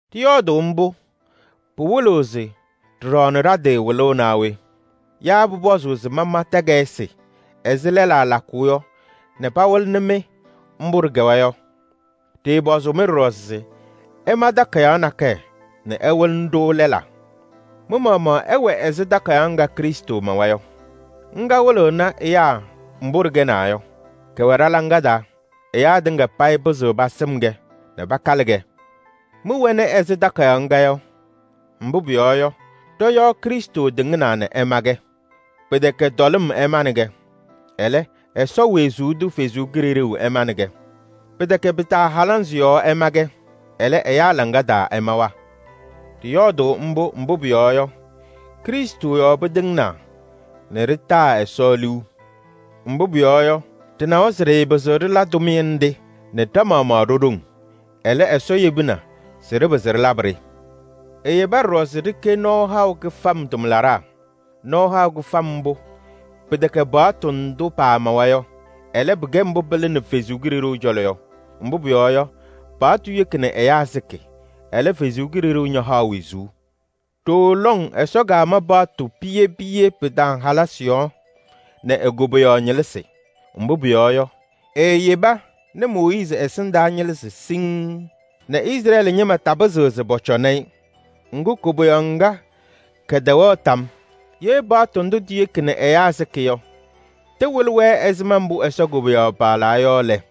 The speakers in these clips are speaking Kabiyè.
Ɖɩyɔɔdʋʋ mbʋ yɔ, pɩwɩlɩɣ se ɖɩɖaɣnɩɣ ɖa-tɩ wɩlʋʋ naa we? Yaa pʋpɔzʋʋ se pama takayɩsɩ ɛzɩ lɛlaa lakʋʋ yɔ nɛ pawɩlɩnɩ-mɩ mbʋ ɖɩkɛwa yɔ? Ɖɩɩpɔzʋʋ-mɩ ɖɔɖɔ se ɩma takayaɣ nakɛyɛ nɛ ɩwɩlɩnɩ-ɖʋ lɛlaa. Mɩ-maɣmaɣ ɩwɛ ɛzɩ takayaɣ ŋga Krɩstʋ mawa yɔ. Ŋga wɩlɩɣnɩ ɛyaa mbʋ ɖɩkɛnaa yɔ. Kɛwɛ ɖɔ-hɔ taa. Ɛyaa tɩŋa payɩ pɩzɩɣ pasɩm-kɛ nɛ pakalɩ-kɛ. Mɩwɛnɩ ɛzɩ takayaɣ ŋga yɔ. Mbʋ pʋyɔɔ yɔ, ɖɔ-yɔɔ Krɩstʋ tɩŋnaa nɛ ɛma-kɛ. Pɩtɛkɛ tɔlɩm ɛmanɩ-kɛ, ɛlɛ, Ɛsɔ wezuu tʋ Kalɩzaɣ ɛmanɩ-kɛ. Pɩtɛkɛ pɩtaahɛlɛnzɩ yɔɔ ɛma-kɛ, ɛlɛ, ɛyaa laŋa taa ɛmawa. Ɖɩyɔɔdʋʋ mbʋ, mbʋ pʋyɔɔ yɔ, Krɩstʋ yɔɔ pɩtɩŋnaa nɛ ɖɩtaa Ɛsɔ liu. Mbʋ pʋyɔɔ yɔ, ɖɩnawa se ɖɩɩpɩzɩɣ ɖɩla tʋmɩyɛ nɖɩ nɛ ɖa-maɣmaɣ ɖo-ɖoŋ. Ɛlɛ, Ɛsɔ yebina se ɖɩpɩzɩ ɖɩlabɩ-ɖɩ. Eyeba ɖɔɖɔ se ɖɩkɛ nɔɔ haʋ kɩfam tʋmlaɖaa. Nɔɔ haʋ kɩfam mbʋ pɩtɛkɛ paɣtʋ ndʋ paamawa yɔ. Ɛlɛ, pɩkɛ mbʋ pɩlɩnɩ Ɛsɔ Kalɩzaɣ cɔlɔ yɔ. Mbʋ pʋyɔɔ yɔ, paɣtʋ yeki nɛ ɛyaa sɩkɩ. Ɛlɛ, Ɛsɔ Kalɩzaɣ ñahaɣ wezuu. Ɖooo lɔŋ Ɛsɔ kama paɣtʋ piye piye pɩtaahɛlɛnzɩ yɔɔ nɛ e-koboyaɣ ñɩlɩzɩ. Mbʋ pʋyɔɔ yɔ, eeyeba nɛ Mooyiizi ɛsɩndaa ñɩlɩzɩ siŋŋ nɛ Izrɛɛlɩ ñɩma tapɩzɩɣ se pɔcɔnɩ-ɩ. Ŋgʋ, koboyaɣ ŋga kɛtɛwɛɣ tam yɔɔ. Ye paɣtʋ ndʋ tiyeki nɛ ɛyaa sɩkɩ yɔ, tɩwɩlɩ-wɛ ɛzɩma mbʋ Ɛsɔ koboyaɣ paɣlaa yɔ lɛ,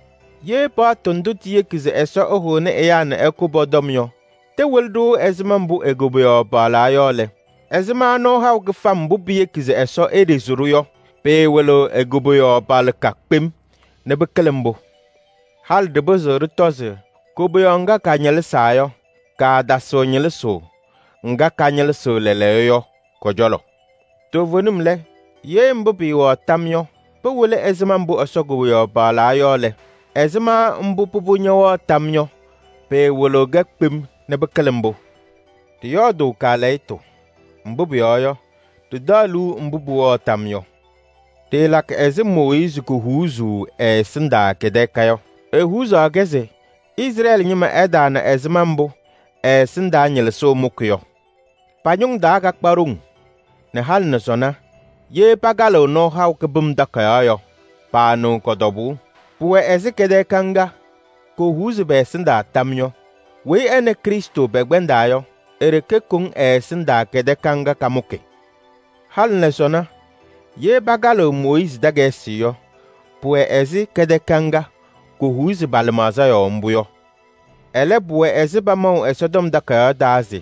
Ye paɣtʋ ndʋ tiyeki se Ɛsɔ ɛhʋnɩ ɛyaa nɛ ɛkʋ pɔ-tɔm yɔ, tɩwɩlɩ-ɖʋ ɛzɩma mbʋ e-koboyaɣ paɣlaa yɔ lɛ, ɛzɩma nɔɔ haʋ kɩfam mbʋ piyeki se Ɛsɔ eɖezi-ɖʋ yɔ, pɩɩwɩlɩɣ e-koboyaɣ paɣlɩka kpem nɛ pɩkɩlɩ mbʋ? Halɩ ɖɩpɩzɩɣ ɖɩtɔ se koboyaɣ ŋga kaañɩlɩzaa yɔ, kaatasɩɣ ñɩlɩzʋʋ ŋga kañɩlɩzɩɣ lɛɛlɛɛyɔ yɔ kɔ-cɔlɔ. Toovenim lɛ, ye mbʋ pɩɩwɛɣ tam yɔ, pɩwɩlɩ ɛzɩma mbʋ Ɛsɔ koboyaɣ paɣlaa yɔ lɛ, ɛzɩma mbʋ pʋbʋ ñɛwɛɣ tam yɔ, pɩɩwɩlɩɣ-kɛ kpem nɛ pɩkɩlɩ mbʋ? Ɖɩyɔɔdʋʋ kaalɛyɩtʋ, mbʋ pʋyɔɔ yɔ, ɖɩtaɣ liu mbʋ pʋwɛɣ tam yɔ. Ɖɩɩlakɩ ɛzɩ Mooyiizi kohuuzuu ɛ-ɛsɩndaa kɛtɛɛka yɔ. Ehuuzaɣ-kɛ se Izrɛɛlɩ ñɩma ɩtaana ɛzɩma mbʋ ɛ-ɛsɩndaa ñɩlɩzʋʋ mʋkɩ yɔ. Pa-ñʋŋ taa kakpa ɖoŋ nɛ halɩ nɛ sɔnɔ ye pakalɩɣ Nɔɔ Haʋ Kɩbɩm Takayaɣ yɔ, paanɩɣ kɔ-tɔbʋʋ. Pʋwɛ ɛzɩ kɛtɛɛka ŋga kohuuzi pɛ-ɛsɩndaa tam yɔ. Weyi nɛ Krɩstʋ pɛkpɛndaa yɔ, e-ɖeke koŋ ɛ-ɛsɩndaa kɛtɛɛka ŋga kamʋkɩ. Halɩ nɛ sɔnɔ, ye pakalɩɣ Mooyiizi takayɩsɩ yɔ, pʋwɛ ɛzɩ kɛtɛɛka ŋga kohuuzi pa-lɩmaɣza yɔɔ mbʋ yɔ. Ɛlɛ, pʋwɛ ɛzɩ pamaʋ Ɛsɔtɔm Takayaɣ taa se: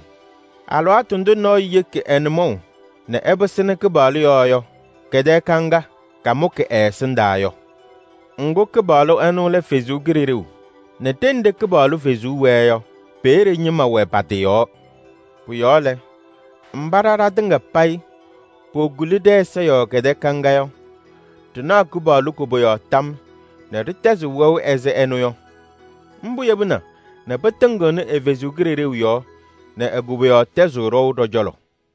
“Alɩwaatʋ ndʋ nɔɔyʋ yeki ɛ-nʋmɔʋ nɛ ɛpɩsɩnɩ Kɩpaɣlʋ yɔɔ yɔ, kɛtɛɛka ŋga, kamʋkɩ ɛ-ɛsɩndaa” yɔ. Ŋgʋ, Kɩpaɣlʋ ɛnʋ lɛ Ɛsɔ Kalɩzaɣ. Nɛ ɖenɖe Kɩpaɣlʋ Kalɩzaɣ wɛɛ yɔ, peeye ñɩma wɛ pa-tɩ yɔɔ. Pʋ-yɔɔ lɛ, mba ɖa ɖatɩŋa payɩ pokuli ɖɛ-ɛza yɔɔ kɛtɛɛka ŋga yɔ, ɖɩnaɣ Kɩpaɣlʋ koboyaɣ tam nɛ ɖɩtɛzɩɣ wɛʋ ɛzɩ ɛnʋ yɔ. Mbʋ yebina nɛ pɩtɩŋɩɣnɩ ɛ-Kalɩzaɣ yɔɔ nɛ e-koboyaɣ tɛzɩɣ ɖɔʋ ɖɔ-cɔlɔ.